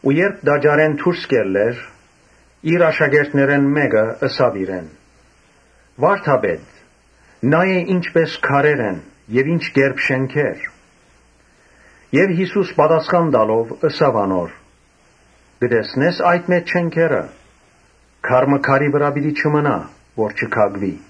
Երբ տաճարէն դուրս կ’ելլէր, իր աշակերտներէն մէկը ըսաւ իրեն. «Վա՛րդապետ, նայէ ի՛նչպէս քարեր են եւ ի՛նչ կերպ շէնքեր»։ Յիսուս պատասխան տալով՝ ըսաւ անոր. «Կը տեսնե՞ս այդ մեծ շէնքերը. քար մը քարի վրայ պիտի չմնայ, որ չքակուի»։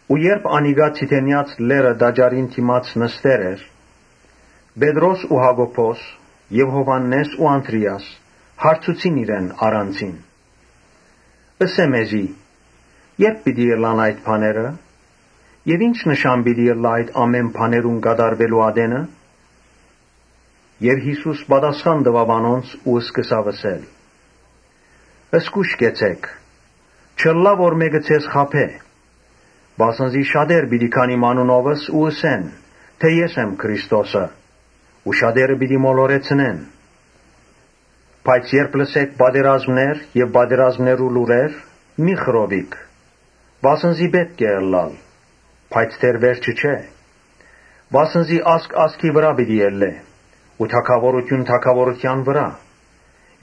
Երբ անիկա Ձիթենեաց լեռը՝ տաճարին դէմ՝ նստեր էր, Պետրոսն ու Յակոբոսը եւ Յովհաննէսն ու Անդրէասը հարցուցին իրեն առանձինն. «Ըսէ՛ մեզի, ե՞րբ պիտի ըլլան այդ բաները եւ ի՞նչ նշան պիտի ըլլայ այդ բաներուն կատարուելու ատենը»։ Յիսուս պատասխան տուաւ անոնց ու ըսաւ. «Զգո՛յշ կեցէք, չըլլայ որ մէկը ձեզ խաբէ. Վասն զի շատեր պիտի գան իմ անունովս ու ըսեն թէ ‘Ես եմ Քրիստոսը’ ու շատերը պիտի մոլորեցնեն։ Բայց երբ լսէք պատերազմներ ու պատերազմներու լուրեր՝ մի՛ խռովիք, վասն զի պէտք է ըլլայ, բայց դեռ «վերջ»ը չէ։ Վասն զի ազգ ազգի վրայ պիտի ելլէ ու թագաւորութիւն թագաւորութեան վրայ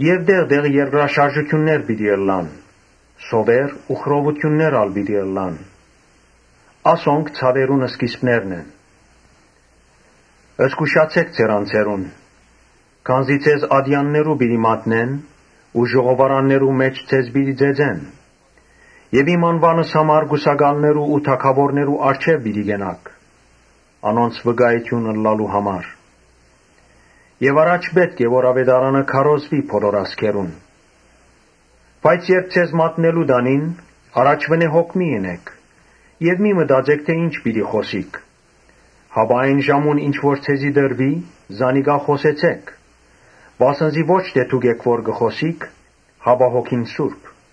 եւ տեղ տեղ երկրաշարժներ պիտի ըլլան. սովեր ու խռովութիւններ ալ պիտի ըլլան։ Ասոնք ցաւերուն սկիզբն են։ Զգուշացէ՛ք ձեր անձերուն համար. քանզի ձեզ ատեաններու պիտի մատնեն ու ժողովարաններու մէջ ձեզ պիտի ծեծեն եւ իմ անուանս համար կուսակալներու ու թագաւորներու առջեւ պիտի կենաք՝ անոնց վկայութիւն տալու համար։ Առաջ պէտք է որ աւետարանը քարոզուի բոլոր ազգերուն։ Բայց երբ ձեզ մատնելու տանին, առաջուընէ հոգ մի՛ ընէք եւ մի՛ մտածէք թէ ի՛նչ պիտի խօսիք, հապա այն ժամուն ինչ որ ձեզի տրուի՝ զանիկա խօսեցէք. վասն զի ո՛չ թէ դուք էք որ պիտի խօսիք, հապա Սուրբ Հոգին»։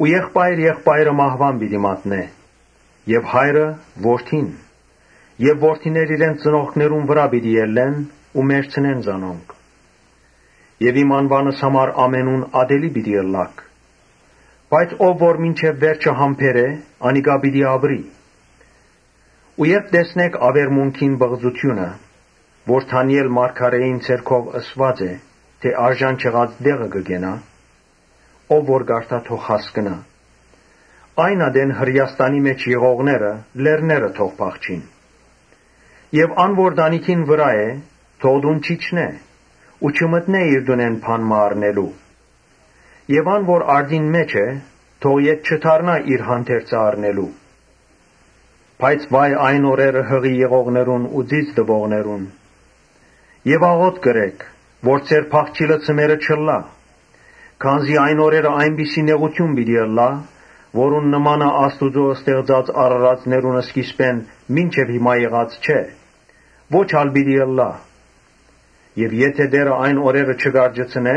«Եղբայր եղբայրը մահուան պիտի մատնէ եւ հայրը՝ որդին եւ որդիներ իրենց ծնողքներուն վրայ պիտի ելլեն ու մեռցնեն զանոնք։ Իմ անուանս համար ամենուն ատելի պիտի ըլլաք։ Բայց ո՛վ որ մինչեւ վերջը համբերէ՝ անիկա պիտի ապրի։ Երբ տեսնէք աւերմունքին պղծութիւնը՝ որ Դանիէլ մարգարէին միջոցաւ ըսուած է, թէ արժան չեղած տեղը կը կենայ, (ով որ կարդայ՝ թող հասկնայ) այն ատեն Հրէաստանի մէջ եղողները լեռները թող փախչին Եւ ան որ տանիքին վրայ է՝ թող տուն չիջնէ ու չմտնէ իր տունէն բան մը առնելու Եւ ան որ արտին մէջ է՝ թող ետ չդառնայ իր հանդերձը առնելու։ Բայց վա՜յ այն օրերը յղի եղողներուն ու ծիծ տուողներուն։ Աղօթք ըրէք, որ ձեր փախչիլը ձմեռը չըլլայ։ Քանզի այն օրերը այնպիսի նեղութիւն պիտի ըլլայ, որուն նմանը Աստուծոյ ստեղծած արարածներուն սկիզբէն մինչեւ հիմա եղած չէ, ո՛չ ալ պիտի ըլլայ։ Եթէ Տէրը այն օրերը չկարճեցնէ,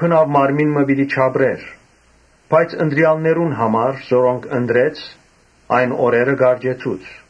բնաւ մարմին մը պիտի չապրի։ Բայց ընտրեալներուն համար որոնք ընտրեց՝ այն օրերը կարճեցուց։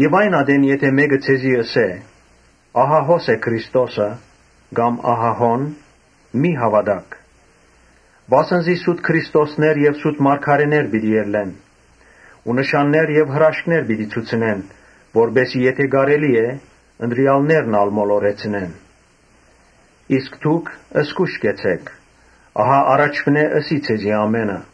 Այն ատեն եթէ մէկը ձեզի ըսէ՝ ‘Ահա հո՛ս է Քրիստոսը’, կամ ‘Ահա հո՛ն’, մի՛ հաւատաք. Վասն զի սուտ քրիստոսներ եւ սուտ մարգարէներ պիտի ելլեն ու նշաններ եւ հրաշքներ պիտի ցուցնեն, որպէս զի եթէ կարելի ըլլայ, ընտրեալներն ալ մոլորեցնեն։ Իսկ դուք զգո՛յշ կեցէք. ահա առաջուընէ ըսի ձեզի ամէնը»։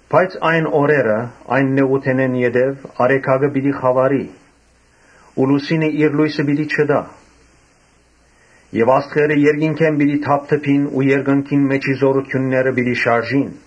«Բայց այն օրերը այն նեղութենէն յետոյ արեգակը պիտի խաւարի ու լուսինը իր լոյսը պիտի չտայ։ Եւ աստղերը երկնքէն պիտի թափթփին ու երկնքին մէջի զօրութիւնները պիտի շարժին։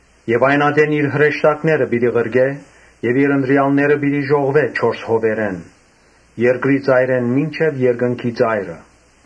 Այն ատեն իր հրեշտակները պիտի ղրկէ եւ իր ընտրեալները պիտի ժողվէ չորս հովերէն, երկրի ծայրէն մինչեւ երկնքի ծայրը»։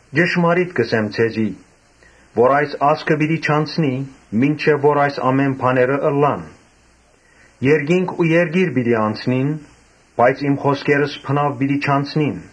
Ճշմարիտ կ’ըսեմ ձեզի, թէ այս ազգը պիտի չանցնի, մինչեւ որ այս ամէն բաները ըլլան։ Երկինք ու երկիր պիտի անցնին, բայց իմ խօսքերս բնաւ պիտի չանցնին»։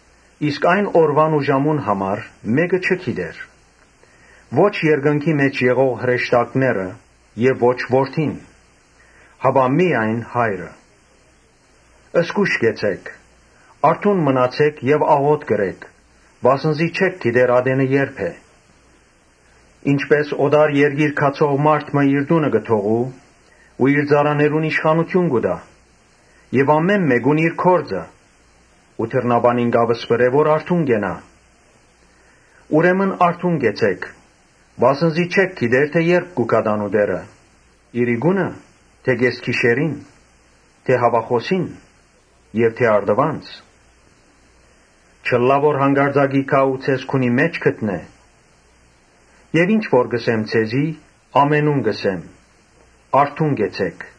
«Իսկ այն օրուան ու ժամուն համար մէ՛կը չի գիտեր, ո՛չ երկնքի մէջ եղող հրեշտակները եւ ո՛չ Որդին. հապա՝ միայն Հայրը։ Զգո՛յշ կեցէք, արթո՛ւն մնացէք եւ աղօթք ըրէք, վասն զի չէք գիտեր ատենը ե՞րբ է։ Ինչպէս օտար երկիր գացող մարդ մը իր տունը կը թողու ու իր ծառաներուն իշխանութիւն կու տայ եւ ամէն մէկուն իր գործը ու դռնապանին կ’ապսպրէ որ արթուն կենայ։ Ուրեմն արթուն կեցէք, վասն զի չէք գիտեր թէ ե՞րբ պիտի գայ տանտէրը, իրիկո՞ւնը՝ թէ կէս գիշերին՝ հաւախօսի՞ն՝ թէ առտուն։ Չըլլայ որ յանկարծակի գայ ու ձեզ քունի մէջ գտնէ։ Եւ ինչ որ կ’ըսեմ ձեզի՝ ամենուն կ’ըսեմ. ‘Արթո՛ւն կեցէք’»։